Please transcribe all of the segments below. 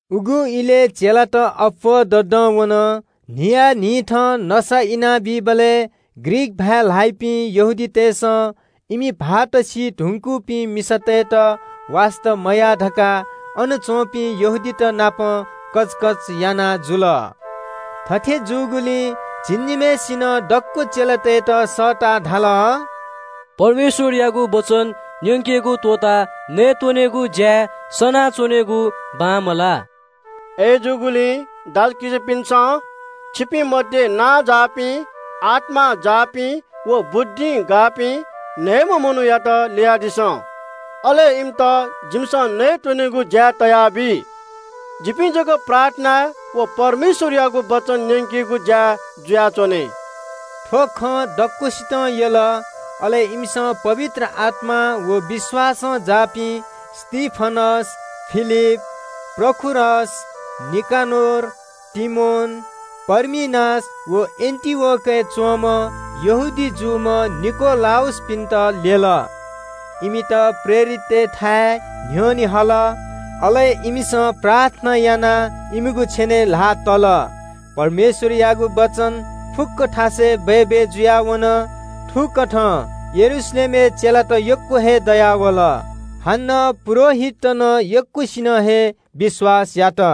उगु इलय् चेलात अप्‍वः ददं वन। न्‍हियान्‍हिथं नसा इनाबीबलय् ग्रीक भाय् ल्‍हाइपिं यहूदीतय्‌सं इमि भाःत मदुपिं मिसातय्‌त वास्‍ता मयाः धकाः हिब्रू भाय् ल्‍हाइपिं यहूदीत नाप कचकच याना हल। थथे जूगुलिं झिंनिम्‍हय्‌सिनं दक्‍व चेलातय्‌त सःताः धाल – “परमेश्‍वरयागु वचन न्‍यंकेगु त्‍वःताः नयेत्‍वनेगु ज्‍याय् सनाच्‍वनेगु बांमलाः। अय्‌जूगुलिं दाजुकिजापिन्‍सं, छिपिं मध्‍ये नांजाःपिं, आत्‍मां जाःपिं व बुद्धिं जाःपिं न्‍हय्‌म्‍ह मनूयात ल्‍ययादिसँ। अले इमित नयेत्‍वनेगु ज्‍याय् तयाबी। जिपिं जक प्रार्थनाय् व परमेश्‍वरयागु वचन न्‍यंकेगु ज्‍याय् जुयाच्‍वने।” थ्‍व खँ दक्‍वसितं यल। अले इमिसं पवित्र आत्‍मां व विश्‍वासं जाःपिं स्‍तिफनस, फिलिप, प्रखरस, निकनोर, तीमोन, पर्मिनास व एन्‍टिओखियां वःम्‍ह यहूदी जूम्‍ह निकोलाउसपिन्‍त ल्‍यल। इमित प्रेरिततय्‌थाय् न्‍ह्यःने हल। अले इमिसं प्रार्थना यानाः इमिगु छेनय् ल्‍हाः तल। परमेश्‍वरयागु वचन फुक्‍क थासय् बय्‌बय् जुयाः वन। थुकथं यरूशलेमय् चेलात यक्‍व हे दयावल। हानं पुजाहारीत नं यक्‍वसिनं हे विश्‍वास यात।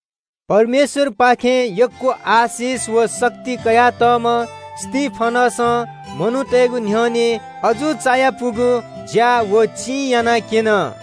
परमेश्‍वरपाखें यक्‍व आशिष व शक्ति कयातःम्‍ह स्‍तिफनसं मनूतय्‌गु न्‍ह्यःने अजू चायापुगु ज्‍या व चिं यानाक्‍यन।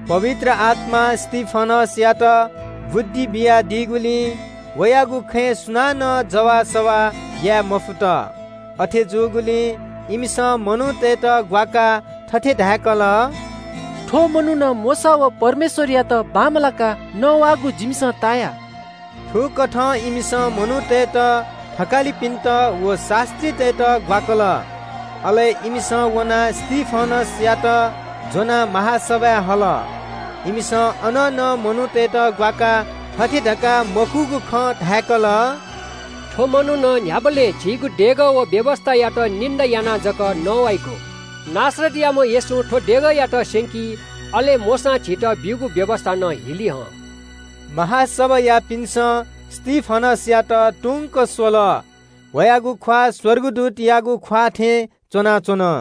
पवित्र आत्‍मां स्‍तिफनसयात बुद्धि बियादीगुलिं वयागु खँय् सुनानं जवाःसवाः याये मफुत। अथे जूगुलिं इमिसं मनूतय्‌त ग्‍वाकाः थथे धाय्‌कल – “थ्‍व मनुखं मोशा व परमेश्‍वरयात क्‍वह्यंकाः नवाःगु जिमिसं ताया।” थुकथं इमिसं मनूतय्‌त, थकालिपिन्‍त व शास्‍त्रीतय्‌त नं ग्‍वाकल। अले इमिसं वनाः स्‍तिफनसयात ज्‍वनाः महासभाय् हल। इमिसं अन नं मनूतय्‌त ग्‍वाकाः थथे धकाः मखुगु खँ धाय्‌कल – “थ्‍व मनुखं न्‍ह्याबलें झीगु देगः व व्‍यवस्‍थायात निन्‍दा यानाः जक नवाइगु। नासरतयाम्‍ह येशूं थ्‍व देगःयात स्‍यंकी, अले मोशां झीत ब्‍यूगु रितिथिति नं हिली हं।” महासभायापिन्‍सं स्‍तिफनसयात तुंक स्‍वःबलय् वयागु ख्‍वाः स्‍वर्गदूतयागु ख्‍वाः थें थियाच्‍वंगु खन।